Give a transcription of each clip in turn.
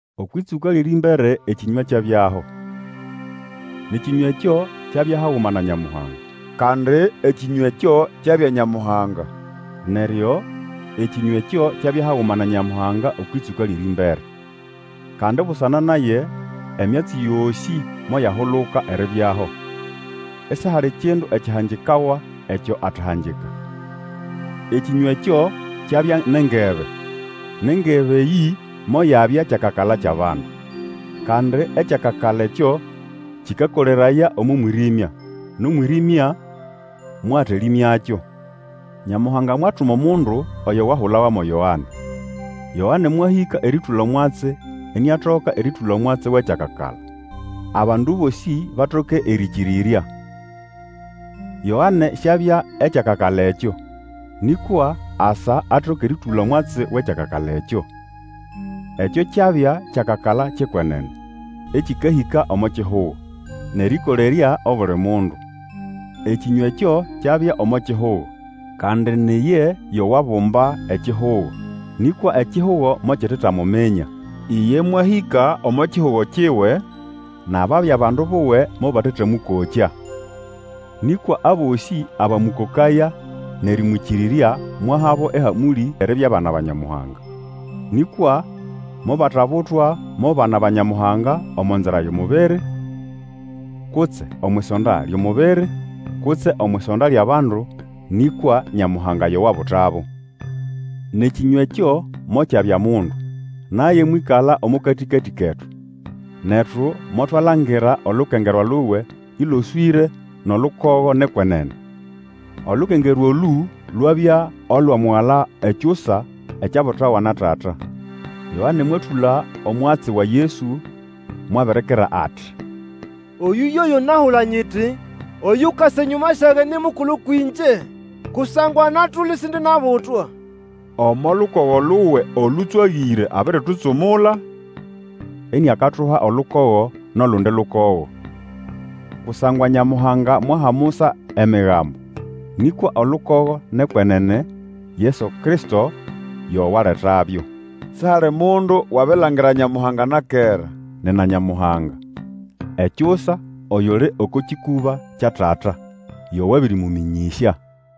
Okwʼĩtsũka lyʼerĩmbere Ekĩnywa kyabyaho, nʼEkĩnywa ekyo kyabya haguma na Nyamuhanga, kandi Ekĩnywa ekyo kyabya Nyamuhanga. Neryo Ekĩnywa ekyo kyabya haguma na Nyamuhanga okwʼĩtsũka lyʼerĩmbere. Kandi busana naye emyatsi yosĩ moyahuluka eribyaho, isihali kindu ekyahangikawa ekyo atahangika. Ekĩnywa ekyo kyabya nʼengebe, nʼengebe eyĩ moyabya kyakakala kyʼabandu. Kandi ekyakakala ekyo kĩkakoleraya omo mwĩrĩmya, nʼomwĩrĩmya mwatalĩmyakyo. Nyamuhanga mwatuma omundu, oyo wahulawa mo Yoane. Yoane mwahĩka erĩtũla omwatsi iniatoka erĩtũla omwatsi wʼekyakakala, abandu bosĩ batoke erĩkĩrĩrya. Yoane siabya ekyakakala ekyo, nĩkwa asa atoke erĩtũla omwatsi wʼekyakakala ekyo. Ekyo kyabya kyakakala kyʼekwenene ekĩkahĩka omo kihugo, nʼerĩkolerya obuli mundu. Ekĩnywa ekyo kyabya omo kihugo, kandi ni iye yo wabumba ekihugo, nĩkwa ekihugo mokitetamuminya. Iye mwahĩka omo kihugo kiwe, nʼababya bandu buwe mobatetamũkokya. Nĩkwa abosĩ abamũkokaya, nʼerĩmwĩkĩrĩrya, mwahabo ehamũlĩ eribya bana ba Nyamuhanga. Nĩkwa mobatabutwa mo bana ba Nyamuhanga omo nzira yʼomubiri, kutse omwʼisonda lyʼomubiri, kutse omwʼisonda lyʼabandu, nĩkwa Nyamuhanga yo wabutabo. NʼEkĩnywa ekyo mokyabya mundu, naye mwĩkala omo katĩkatĩ ketu. Netu motwalangira olukengerwa luwe ĩloswĩre nʼolukogo nʼekwenene. Olukengerwa olũ lwabya olwa Mugala Ekyusa ekyabutawa na Tata. Yoane mwatũla omwatsi wa Yesu, mwabirikira ati, Oyũ yoyo nahula nyiti, Oyukasa enyũma syage ni mukulu kwĩngye, kusangwa anatula isindinabutwa. Omo lukogo luwe olũtswagĩre abiritutsumula, iniakatuha olukogo nʼolundi lukogo. Kusangwa Nyamuhanga mwaha Musa Emigambo, nĩkwa olukogo nʼekwenene, Yesu Kristo yo waletabyo. Sihali mundu wabilangira Nyamuhanga na kera; nina Nyamuhanga. Ekyusa, oyuli oko kĩkũba kya Tata, yo wabirimũmĩnyĩsya.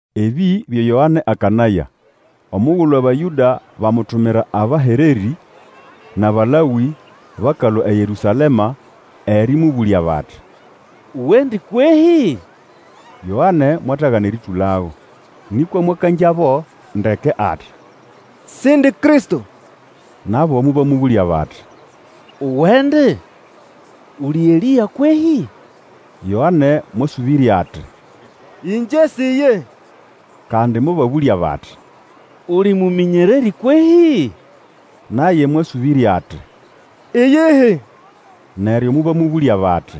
Ebĩ byo Yoane akanaya, omugulu Abayũda bamutumira abahererĩ nʼAbalawĩ bakalũa eYerũsalema erĩmũbũlya bati, Uwendi kwehĩ? Yoane mwatagana erĩtũlago, nĩkwa mwakangyabo ndeke ati, Sindi Kristo. Nabo mobamũbũlya bati, Uwendi? Uli Elĩa kwehĩ? Yoane mwasũbĩrya ati, Ĩngye si iye. Kandi mobabũlya bati, Uli mũmĩnyererĩ kwehĩ? Naye mwasũbĩrya ati, Iyihi. Neryo mobamũbũlya bati,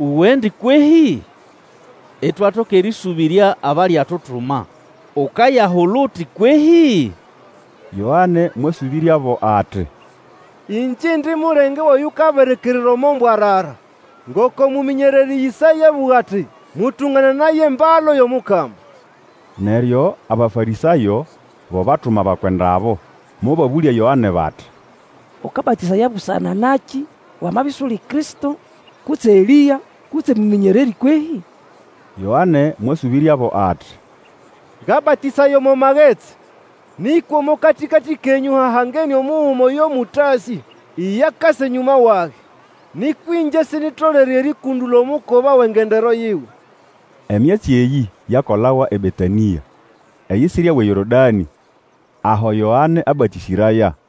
Uwendi kwehĩ? Itwatoka erĩsũbĩrya abaliatutuma. Ukayahula uti kwehĩ? Yoane mwasũbĩryabo ati, Ĩngye indi mulenge wʼoyukabirikirira omo mbwarara, ngoko mũmĩnyererĩ Ĩsaya abũga ati, Mũtũngananaye embalu yʼomukama. Neryo Abafarĩsayo bo batuma abakwenda abo. Mobabũlya Yoane bati, Ũkabatĩsaya busana nakĩ wamabya isuli Kristo, kutse Elĩa, kutse mũmĩnyererĩ kwehĩ? Yoane mwasũbĩryabo ati, Ngabatĩsaya omo magetsi, nĩkwa omo katĩkatĩ kenyũ hahangene omuguma oyo mũtasĩ. Iye akasa enyũma wage, nĩkwa ĩngye sinyitolere erĩkũndũla omukoba wʼengendero yiwe. Emyatsi eyĩ yakolawa eBetanĩa, eyisirya wʼeYorodanĩ, aho Yoane abatĩsĩraya.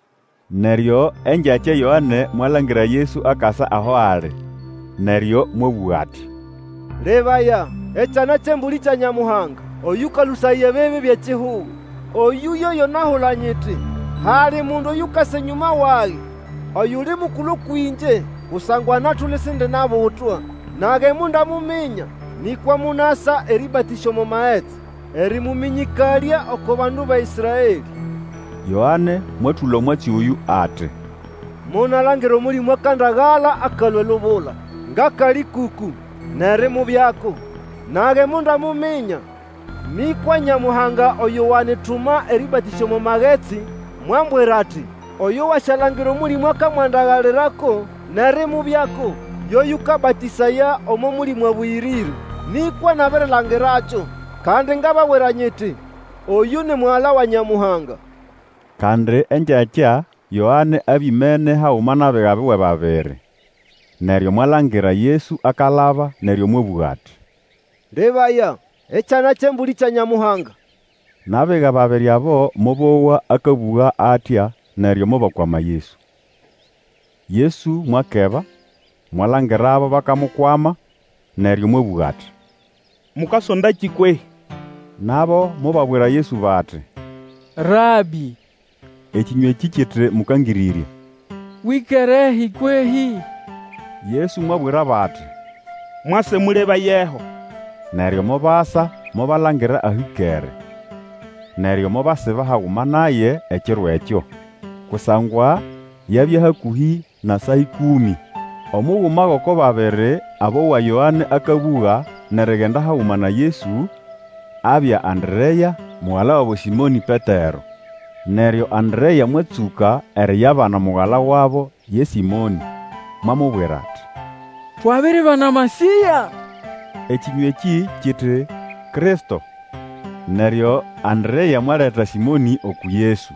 Neryo engyakya Yoane mwalangira Yesu akasa aho ali, neryo mwabũga ati, Lebaya, Ekyana kyʼEmbũlĩ kya Nyamuhanga oyũkalũsaya ebibi byʼekihugo! Oyũ yoyo nahula nyiti, Hali mundu oyukasa enyũma wage, oyuli mukulu kwĩngye, kusangwa anatula isindinabutwa. Nage mondamuminya, nĩkwa monasa erĩbatĩsya omo magetsi, erĩmũmĩnyĩkalya oko bandu ba Ĩsraelĩ. Yoane mwatũla omwatsi oyũ ati, Monalangira Omũlĩmũ akandagala akalũa elubula ngʼakalĩkũkũ, nʼerimubyako. Nage mondamuminya, nĩkwa Nyamuhanga oyo wanyituma erĩbatĩsya omo magetsi, mwambwira ati, Oyo wasyalangira Omũlĩmũ akamwandagalirako nʼerimubyako, yo yũkabatĩsaya omo Mũlĩmũ Abũyĩrĩre. Nĩkwa nabirilangirakyo, kandi ngababwira nyiti, Oyũ ni Mugala wa Nyamuhanga. Kandi engyakya Yoane abya imene haguma nʼabiga buwe babiri. Neryo mwalangira Yesu akalaba, neryo mwabũga ati, Lebaya, Ekyana kyʼEmbũlĩ kya Nyamuhanga! Nʼabiga babiri abo mobowa akabũga atya neryo mobakwama Yesu. Yesu mwakeba, mwalangirabo bakamukwama, neryo mwabũga ati, Mukasondakĩ kwehĩ? Nabo mobabwira Yesu bati, Rabĩ, ekĩnywa ekĩ kiti Mũkangĩrĩrya, wĩkerehi kwehĩ? Yesu mwabwirabo ati, Mwase, mũlebayeho. Neryo mobasa mobalangira aho ĩkere. Neryo mobasiba haguma naye ekiro ekyo, kusangwa yabya hakũhĩ na saa ĩkũmĩ. Omuguma gʼoko babiri abowa Yoane akabũga nʼerigenda haguma na Yesu, abya Anderea, mugala wabo Sĩmonĩ Petero. Neryo Anderea mwatsũka eriyabana mugala wabo ye Sĩmonĩ, mwamubwira ati, Twabiribana Masĩya, (Ekĩnywa ekĩ kiti, Kristo). Neryo Anderea mwaleta Sĩmonĩ uku Yesu.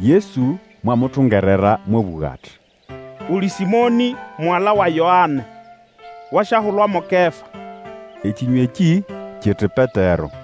Yesu mwamutungerera mwabũga ati, Uli Sĩmonĩ, mugala wa Yoane. Wasyahulwa mo Kefa (Ekĩnywa ekĩ kiti, Petero).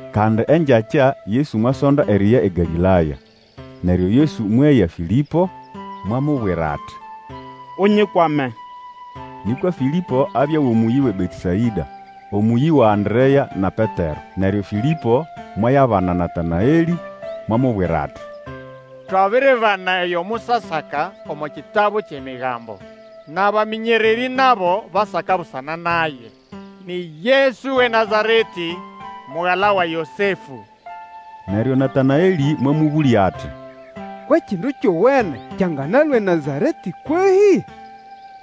Kandi engyakya Yesu mwasonda eriya eGalĩlaya. Neryo Yesu mweya Fĩlĩpo, mwamubwira ati, Unyikwame. Nĩkwa Fĩlĩpo abya wʼomũyĩ wʼeBetesaĩda, omũyĩ wa Anderea na Petero. Neryo Fĩlĩpo mwayabana Natanaelĩ, mwamubwira ati, Twabiribana oyo Musa asaka omo kitabu kyʼEmigambo, nʼabamĩnyererĩ nabo basaka busana naye. Ni Yesu wʼeNazaretĩ, mugala wa Yosefũ. Neryo Natanaelĩ mwamũbũlya ati, Kwʼekindu kyowene kyanganalũa eNazaretĩ kwehĩ?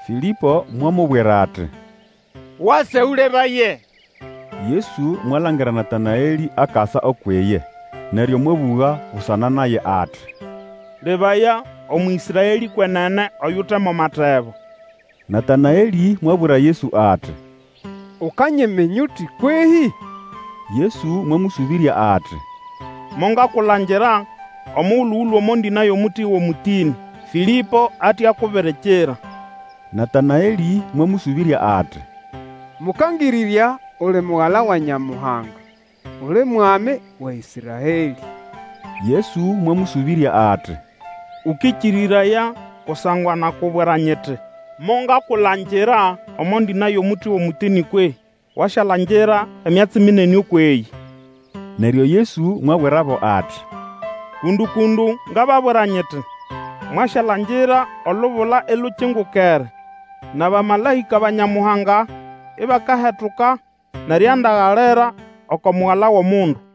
Fĩlĩpo mwamubwira ati, Wase Ũlebaye. Yesu mwalangira Natanaeli akasa ukwʼiye, neryo mwabũga busana naye ati, Lebaya, Omũĩsraelĩ kwenene, oyute mo matebo! Natanaelĩ mwabwira Yesu ati, Ukanyiminya uti kwehĩ? Yesu mwamũsũbĩrya ati, Mongakulangira omugulu Ũlũe omo ndĩna yʼomuti wʼomũtĩnĩ, Fĩlĩpo ate akubirikira. Natanaelĩ mwamũsũbĩrya ati, Mũkangĩrĩrya, uli Mugala wa Nyamuhanga! Uli Mwami wa Ĩsraelĩ! Yesu mwamũsũbĩrya ati, Ukĩkĩrĩraya kusangwa nakubwira nyiti, Mongakulangira omo ndĩna yʼomuti wʼomũtĩnĩ kwehĩ? Wasyalangira emyatsi minene ũkwʼeyĩ Neryo Yesu mwabwirabo ati, Kũndũ-kũndũ, ngababwira nyiti, mwasyalangira olubula ilukingukere, nʼabamalaĩka ba Nyamuhanga ibakahetuka nʼeriandagalira oko Mugala wʼOmundu.